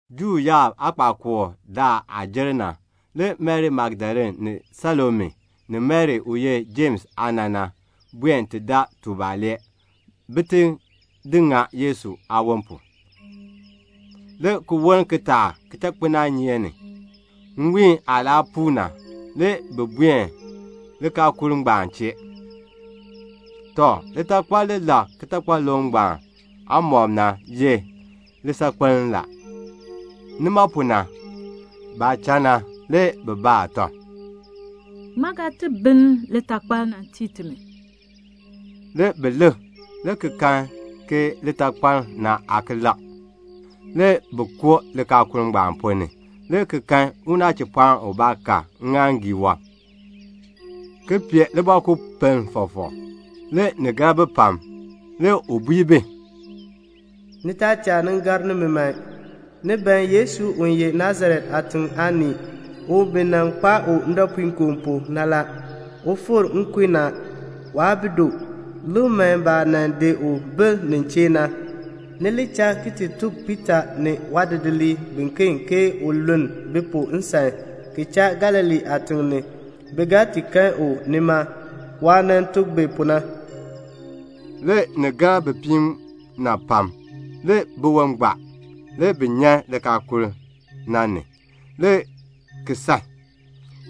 Juu yaab aakpakool daal aah jer na, le Mari Magdalene ni Salome, ni Mari u ye Jems aana na, buen ti daa tubalee, bin ti di ŋa Yesu aawon pu. Le ki woln kitaak kichakpinaanyeek ni, nwiin aah laa puu na, le bi buen likaakul ngbaan chee. Tɔ, litakpal li lek kitakpaluŋ aamɔb na ye lisaakpiln na. Nima pu na, baah cha na, le bi baa tɔb, "Ŋmaa ga ti binn litakpal na ki tii timi?" Le bi lik, le ki kan ke litakpal na aa ki lek. Le bi koo likaakul na ponn ni le ki kan unachipɔɔn ubaa ka ŋŋaaŋgii wɔb ki pee libɔkupiln fɔfɔk. Le ni gar bi pam. Le u bui bi, "Ni taa cha ni gar nimi man. Ni ban Yesu u ye Nasaret aatiŋ aanii na, u bi nan kpaa u ndɔpuinkoo pu na la. U fikr nkun ni a. Waa bi du. Lik man baah nan di u bil nin chee na. Ni li cha ti tuk Piita ni waadidiliib biken ke u luln bi pu nsan, ki cha Galilee aatiŋ la. Bi ga ti kan u nima, waah nan tuk bi pu na." Le ni gar bipiib na pam, le biwon gbaa. Le bi nyan likaakul na ni, le ki san.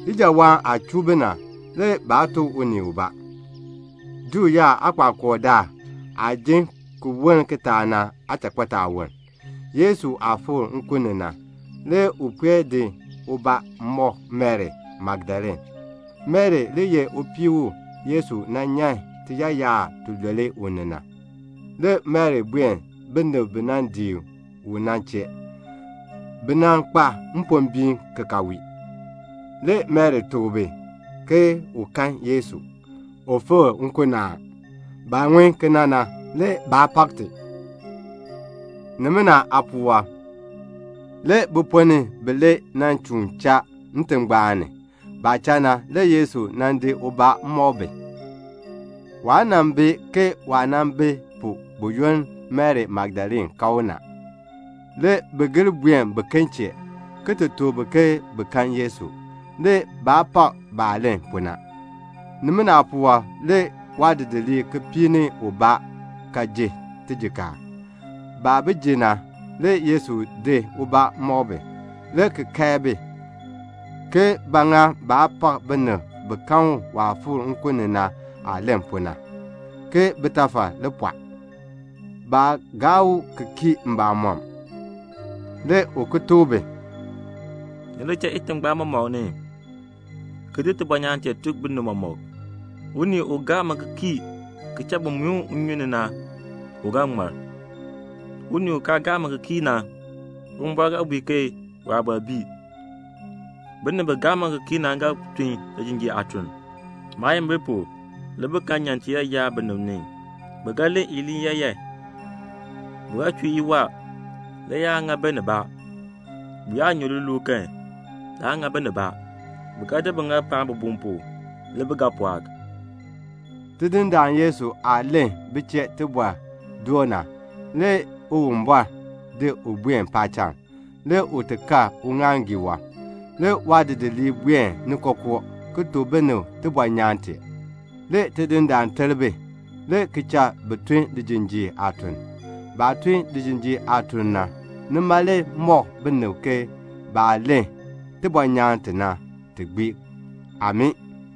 Ijawaan aah chuu bi na, le baa tuk unii ubaa. Juu yaab aakpakool daal aah jin ki woln kitaak na aachakpitaawoln, Yesu aah fikr nkun ni na, le u puen di ubaa mɔk Mari Magdalene. Mari le ye upii u Yesu nan nyan tiyaayar tilule u ni na. Le Mari buen binib bi nan dii Yesu na chee. Bi kpa mpombiin ki ka wii. Le Mari tuk bi ke u kan Yesu, u fikr nkun ni a. Baah ŋun kena na, le baa pak ti. Nimina aapuwɔb, le bi ponn ni bilee nan chuun cha ntingbaan ni. Baah cha na, le Yesu nan di ubaa mɔk bi. Waa bi ke waah bi pu buyoonn Mari Magdalene kan u na. Le bi gir buen biken chee, ki ti tuk bi ke bi kan Yesu. Le baa pak baah len pu na. Nimina aapuwɔb le waadidiliib kipiik ni ubaa ka ji tijikaar. Baah ji na, le Yesu di ubaa ki di mɔk bi, le ki kae bi, ke ba ŋa baa pak binib bi kan u waah fikr nkun ni na aah len pu na, ke bitafal le pɔɔ. Baa gaa u ki kii mbamɔm. Le u ki tuk bi, "Ni li cha itingbaan mɔmɔk ni, ki di tibɔnyaan tee ki tuk binib mɔmɔk. Unii u gaa mi ki kii ki cha bi muin u nnyun ni na, u ga ŋmar. Unii u kaa gaa mi ki kii na, Uwumbɔr ga bui ke waabɔr bii. Binib bi gaa mi ki kii na ga tun lijinjiir aatun. Maayimbil pu le bi ga nyan tiyaayar binib ni; bi ga len iliin yaayan; bi ga chuu iwaa, le yaan ŋa bi nibaa. Bi yaa nyu liluul kan, laan ŋa bi nibaa. Bi ga di biŋaal paan bibum pu, le bi ga pɔɔk." Tidindaan Yesu aah len bi chee tibɔr doo na, le Uwumbɔr di u buen paacham, le u ti kal uŋaaŋgii wɔb. Le waadidiliib buen ni kookoo, ki tuk binib tibɔnyaan tee. Le Tidindaan ter bi, le ki cha bi tun lijinjiir aatun. Baah tun lijinjiir aatun na, nima le mɔk binib ke baah len tibɔnyaan tee na, ti gbii. Amii.